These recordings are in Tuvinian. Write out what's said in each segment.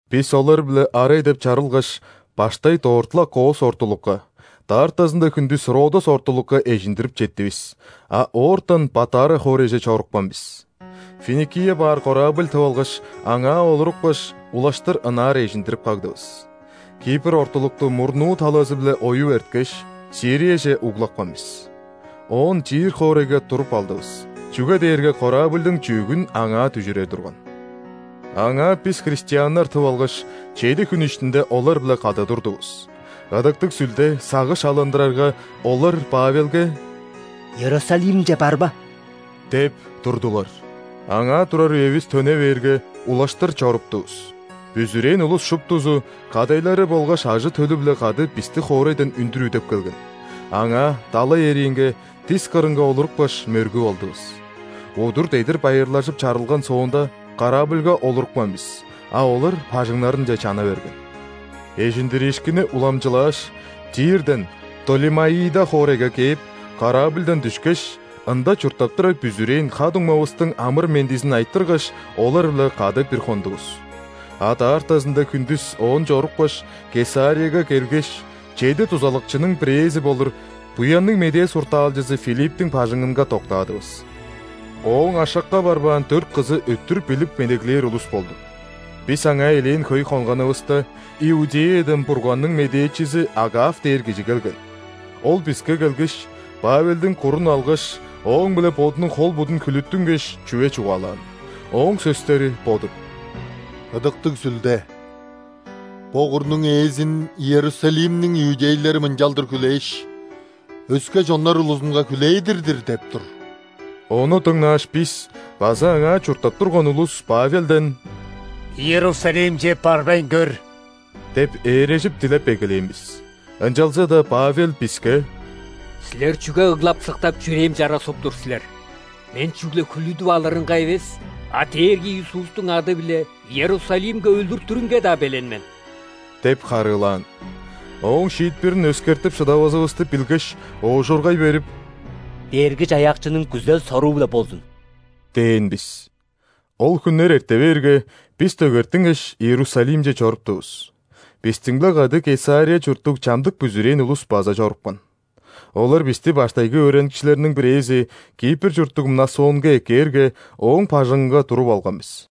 Бис олар-биле арай деп чарылгаш, баштай дорт-ла Кос ортулукка, даартазында хүндүс Родос ортулукка эжиндирип четтивис, а оортан Патара хоорайже чорупкан бис. Финикия баар корабль тып алгаш, аңаа олурупкаш, улаштыр ынаар эжиндирип кагдывыс. Кипр ортулукту мурнуу талазы-биле оюп эрткеш, Сирияже углапкан бис. Оон Тир хоорайга туруп алдывыс, чүге дээрге корабльдың чүъгүн аңаа дүжүрер турган. Аңаа бис христианнар тып алгаш, чеди хүн иштинде олар-биле кады турдувус. Ыдыктыг Сүлде сагыш алындырарга, олар Павелге: «Иерусалимче барба» – деп турдулар. Аңаа турар үевис төне бээрге, улаштыр чоруптувус. Бүзүрээн улус шуптузу кадайлары болгаш ажы-төлү-биле кады бисти хоорайдан үндүр үдеп келген. Аңаа, далай эриинге, дис кырынга олурупкаш, мөргүп алдывыс. Удур-дедир байырлажып чарылган соонда, корабльга олурупкан бис, а олар бажыңнарынче чана берген. Эжиндириишкинни уламчылааш, Тирден Птолемаида хоорайга кээп, корабльдан дүшкеш, ында чурттап турар бүзүрээн ха-дуңмавыстың амыр-мендизин айтыргаш, олар-биле кады бир хондувус. А даартазында хүндүс оон чорупкаш, Кесарияга келгеш, чеди дузалакчының бирээзи болур Буянныг Медээ суртаалчызы Филипптиң бажыңынга доктаадывыс. Ооң ашакка барбаан дөрт кызы өттүр билип медеглээр улус болду. Бис аңаа элээн хөй хонганывыста, Иудеядан Бурганның медээчизи Агав дээр кижи келген. Ол биске келгеш, Павелдиң курун алгаш, ооң-биле бодунуң хол-будун хүлүттүнгеш, чүве чугаалаан. Ооң сөстери бо-дур: «Ыдыктыг Сүлде: „Бо курнуң ээзин Иерусалимниң иудейлери мынчалдыр хүлээш, өске чоннар улузунга хүлээдир-дир“ – деп тур». Ону дыңнааш, бис база аңаа чурттап турган улус Павелден: «Иерусалимче барбайн көр» – деп ээрежип дилеп эгелээн бис. Ынчалза-даа Павел биске: «Силер чүге ыглап-сыктап, чүрээм чара соп тур силер? Мен чүгле хүлүдүп алырынга эвес, а Дээрги Иисустуң ады-биле Иерусалимге өлүртүрүнге-даа белен мен» – деп харыылаан. Ооң шиитпирин өскертип шыдавазывысты билгеш, оожургай берип: «Дээрги-Чаяакчының күзел-соруу-биле болзун!» – дээн бис. Ол хүннер эрте бээрге, бис дөгертингеш, Иерусалимче чоруптувус. Бистиң-биле кады Кесария чурттуг чамдык бүзүрээн улус база чорупкан. Олар бисти баштайгы өөреникчилерниң бирээзи, Кипр чурттуг Мнасонга эккээрге, ооң бажыңынга туруп алган бис.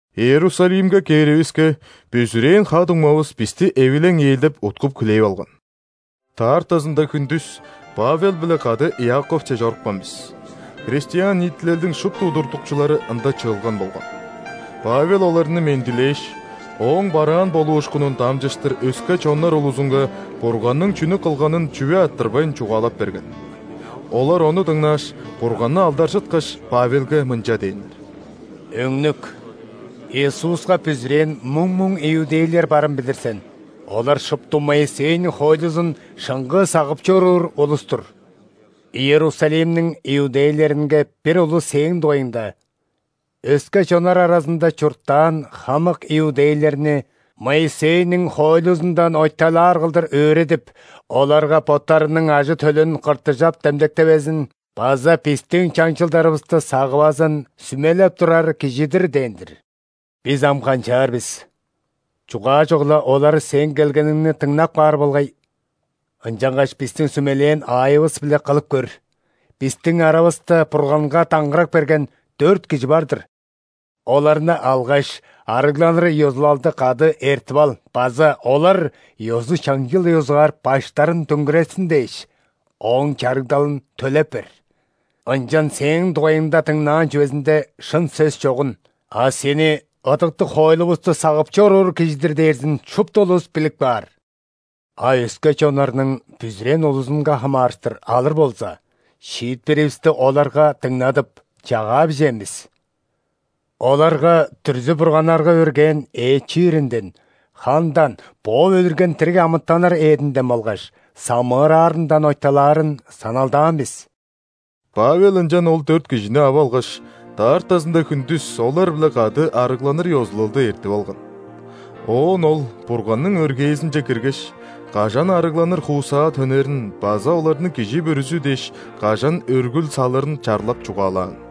Иерусалимге кээривиске, бүзүрээн ха-дуңмавыс бисти эвилең-ээлдек уткуп-хүлээп алган. Даартазында хүндүс Павел-биле кады Иаковче чорупкан бис. Христиан ниитилелдиң шупту удуртукчулары ында чыылган болган. Павел оларны мендилээш, ооң бараан болуушкунун дамчыштыр өске чоннар улузунга Бурганның чүнү кылганын чүве арттырбайн чугаалап берген. Олар ону дыңнааш, Бурганны алдаржыткаш, Павелге мынча дээннер: «Өңнүк, Иисуска бүзүрээн муң-муң иудейлер барын билир сен, олар шупту Моисейниң хоойлузун шыңгыы сагып чоруур улус-тур. Иерусалимниң иудейлеринге бир улус сээң дугайыңда: „Өске чоннар аразында чурттаан хамык иудейлерни Моисейниң хоойлузундан ойталаар кылдыр өөредип, оларга боттарының ажы-төлүн ·кыртыжап демдектевезин база бистиң чаңчылдарывысты сагывазын сүмелеп турар кижи-дир“ – дээн-дир. Бис ам канчаар бис? Чугаажок-ла, олар сээң келгениңни дыңнап каар болгай. Ынчангаш бистиң сүмелээн аайывыс-биле кылып көр. Бистиң аравыста Бурганга даңгырак берген дөрт кижи бар-дыр. Оларны алгаш, ·арыгланыр ёзулалды кады эртип ал база олар ёзу-чаңчыл ёзугаар баштарын дөңгүрертсин дээш, ооң чарыгдалын төлеп бер. Ынчан сээң дугайыңда дыңнаан чүвезинде шын сөс чогун, а сени ыдыктыг хоойлувусту сагып чоруур кижи-дир дээрзин шупту улус билип каар. А өске чоннарның бүзүрээн улузунга хамаарыштыр алыр болза, шиитпиривисти оларга дыңнадып, чагаа бижээн бис. Оларга дүрзү-бурганнарга өргээн эът чииринден, хандан, бооп өлүрген дириг амытаннар эъдинден болгаш самыыраарындан ойталаарын саналдаан бис». Павел ынчан ол дөрт кижини ап алгаш, даартазында хүндүс олар-биле кады арыгланыр ёзулалды эртип алган. Оон ол Бурганның өргээзинче киргеш, кажан арыгланыр хуусаа төнерин база оларның кижи бүрүзү дээш, кажан өргүл салырын чарлап чугаалаан.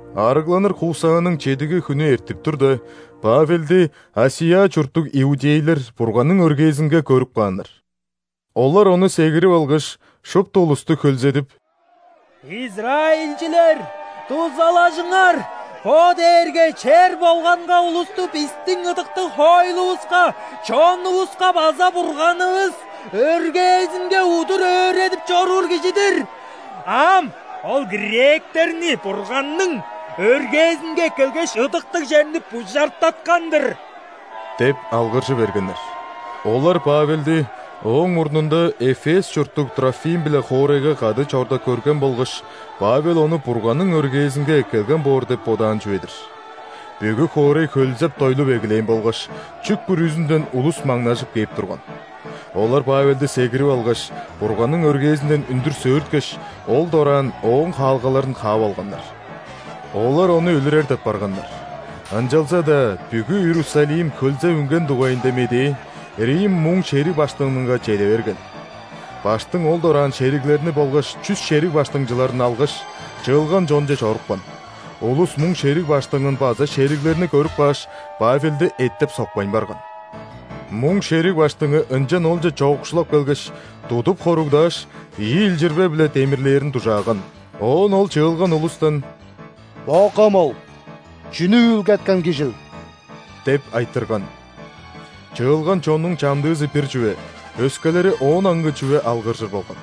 Арыгланыр хуусааның чедиги хүнү эртип турда, Павелди ·Асия чурттуг иудейлер Бурганның өргээзинге көрүп кааннар. Олар ону сегирип алгаш, шупту улусту хөлзедип: «Израильчилер! Дузалажыңар! Бо дээрге чер болганга улусту бистиң ыдыктыг хоойлувуска, чонувуска база Бурганывыс өргээзинге удур өөредип чоруур кижи-дир. А ам ол гректерни Бурганның өргээзинге эккелгеш, ыдыктыг черни бужартаткан-дыр» – деп алгыржы бергеннер. Олар Павелди ооң мурнунда Эфес чурттуг Трофим-биле хоорайга кады чорда көрген болгаш, Павел ону Бурганның өргээзинге эккелген боор деп бодаан чүве-дир. Бүгү хоорай хөлзеп-дойлуп эгелээн болгаш, чүк бүрүзүнден улус маңнажып кээп турган. Олар Павелди сегирип алгаш, Бурганның өргээзинден үндүр сөөрткеш, ол дораан ооң хаалгаларын хаап алганнар. Олар ону өлүрер деп барганнар, ынчалза-даа бүгү Иерусалим хөлзеп үнген дугайында медээ рим муң шериг баштыңынга чеде берген. ·Баштың ол дораан шериглерин болгаш чүс шериг баштыңчыларын алгаш, чыылган чонче чорупкан. Улус муң шериг баштыңын база шериглерни көрүп кааш, Павелди эттеп-сокпайн барган. Муң шериг баштыңы ынчан олче чоокшулап келгеш, тудуп хоругдааш, ийи илчирбе-биле демирлээрин дужааган. Оон ол чыылган улустан: «Бо кымыл, чүнү үүлгеткен кижил?» – деп айтырган. Чыылган чоннуң чамдыызы бир чүве, өскелери оон аңгы чүве алгыржыр болган.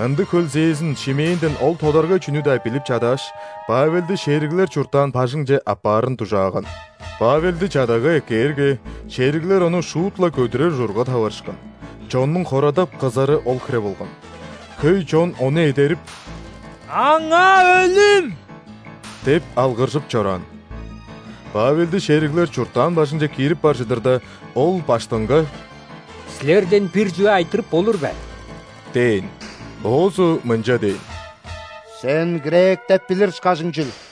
Ындыг хөлзээзин, шимээнден ол тодаргай чүнү-даа билип чадааш, Павелди шериглер чурттаан бажыңче аппаарын дужааган. Павелди чадага эккээрге, шериглер ону шуут-ла көдүрер ужурга таварышкан – чоннуң хорадап, кызары ол хире болган. Хөй чон ону эдерип: «Аңаа өлүм!» – деп алгыржып чораан. Павелди шериглер чурттаан бажыңче киирип бар чыдырда, ол ·баштыңга: «Силерден бир чүве айтырып болур бе?» – дээн. Оозу мынча дээн: «Сен гректеп билир ышкажың чүл.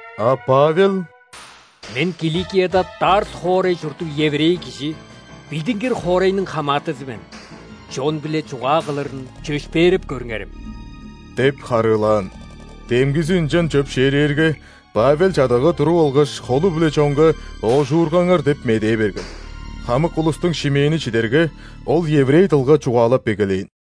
А Павел: «Мен – Киликияда Тарс хоорай чурттуг еврей кижи, билдингир хоорайның хамаатызы мен. Чон-биле чугаа кылырын чөпшээреп көрүңерем» – деп харыылаан. Демгизи ынчан чөпшээрээрге, Павел чадага туруп алгаш, холу-биле чонга «Оожургаңар!» деп медээ берген. Хамык улустуң шимээни чидерге, ол еврей дылга чугаалап эгелээн.